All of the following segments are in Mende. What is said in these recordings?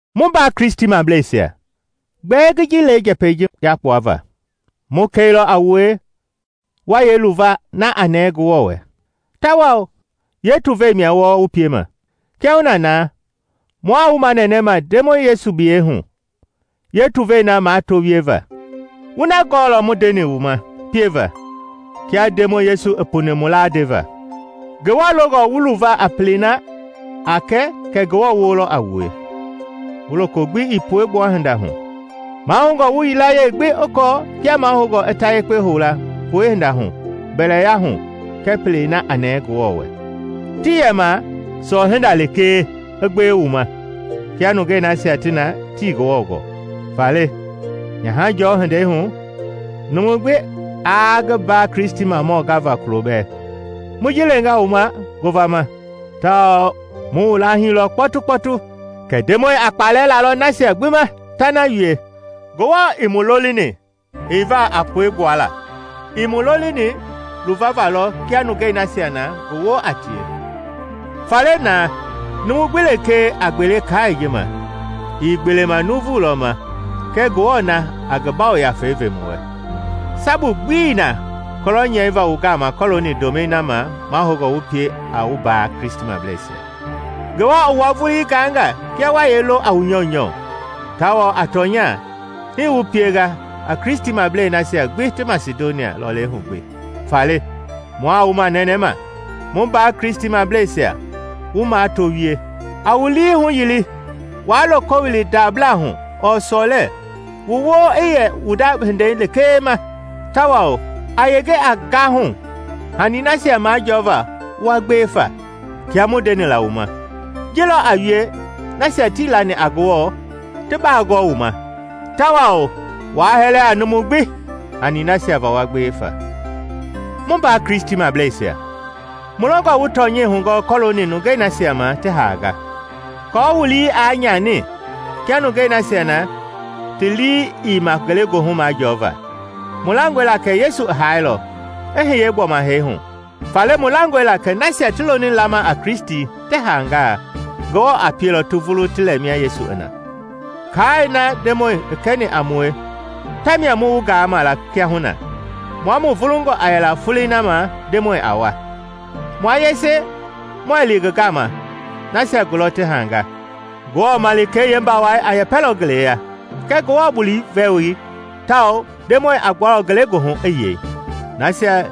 Mu mbaa Kristimableisia, gbɛɛ ngi ji le njɛpɛi ji yakpuava: mu kɛilɔ a wue wa yee luva na a nɛɛ Ngewɔ wɛ. Tawao yeetuvei mia wɔɔ wu piema. Kiahuna na mua wu manɛnɛma Ndemɔi Yesu biyɛi hu yeetuvei na mato wieva. Wu na gɔɔlɔ mu ndeni wu ma pieva kia Ndemɔi Yesu i puni mu laa ndeva. Ngewɔ longɔ wu luva a pelei na a kɛ kɛ Ngewɔ woo lɔ a wue, wu loko gbi ii puegbua hinda hu. Mahoungɔ wu yilayee gbi i kɔɔ kia mahoungɔ i ta yekpe houla puehinda hu mbɛlɛya hu kɛɛ pelei na a nɛɛ Ngewɔ wɛ, tii yɛma sɔɔ-hinda lekee i gbewe wu ma kia nungei nasia ti na tii Ngewɔ gɔɔ. Faale Nyahajɔɔ hindei hu, numu gbi aa ngi mba Kristimamɔ gava kulo bɛɛ. Mu ji lenga wu ma ngovama tawao mu wu laahilɔ kpɔtukpɔtu kɛ Ndemɔi a kpalɛ lalɔ nasia gbi ma ta na wie. Ngewɔ ii mu lolini heiva a puegbuala, i mu lolini luvava lɔ kia nungei nasia na ngi woo a tie. Faale na, numu gbi lekee a gbele kaai ji ma, ii gbeelema nuuvu lɔ ma kɛ Ngewɔ na a ngi Yafa Yekpei ve wu wɛ. Sabu gbii na kɔlɔ nyɛiva wu gama kɔɔlooni ndomɛi na ma mahoungɔ wu pie a wu mbaa Kristimableisia. Ngewɔ i wua vulii gaanga kia wa yee lo a wu nyɔunyɔ. Tawao a tɔnya, hii wu pienga a Kristimablei nasia gbi ti Masidonia lɔlei hu gbi. Faale, mua wu manɛnɛma, mu mbaa Kristimableisia, wu mato wie. A wu lii huyili waa loko wili ndabla hu ɔɔ sɔlɛ, wu woo i yɛ wu nda hindei lekee ma, tawao a yenge a gahu hanii nasia majɔɔva wa gbewe fa kia mu ndeni la wu ma. Ji lɔ a wie nasia tii lani a Ngewɔ ti baa gɔɔ wu ma, tawao waa hɛlɛ a numu gbi hanii nasia va wa gbewe fa. Mu mbaa Kristimableisia, Mu longɔ wu tɔnyɛi hugɔɔ kɔɔlooni nungei nasia ma ti haanga, aako wu lii aa nyani, kia nungei nasia ti na ti lii ii ma ngelegoohu majɔɔva. Mu langɔe la kɛ Yesu i haailɔ, i hiye gbɔma hee hu, faale mu langɔe la kɛ nasia ti loni lama a Kristi ti haanga, Ngewɔ a pielɔ ti vulu ti lɛ mia Yesu i na. Kaai na Ndemɔi i kɛni a mue tamia mu wu gaama la kiahuna: Mua mu vulungɔ a yɛla folei na ma Ndemɔi a wa, mua yese muɛɛ li ngi gama nasia gulɔ ti haanga. Ngewɔ malikei yeembawai a yɛpɛlɔ ngeleya, kɛɛ Ngewɔ bulii woi, tawao Ndemɔi a gbualɔ ngelegoohu i yei. Nasia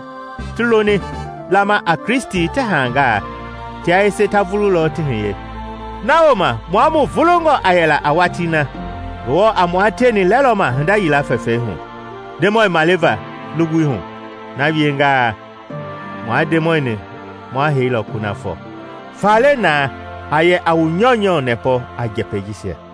ti loni lama a Kristi ti haanga, tia yese ta vulu lɔ ti hiye; na wooma mua mu vulungɔ a yɛla a watii na Ngewɔ a mua tieni lɛlɔma hinda yila fɛfɛi hu, Ndemɔi maliva lugbui hu. Na wiengaa, mua Ndemɔi-ni ma heilɔ kunafɔ. Faale na, a yɛ a wu nyɔunyɔ nɛpɔ a njɛpɛi jisia.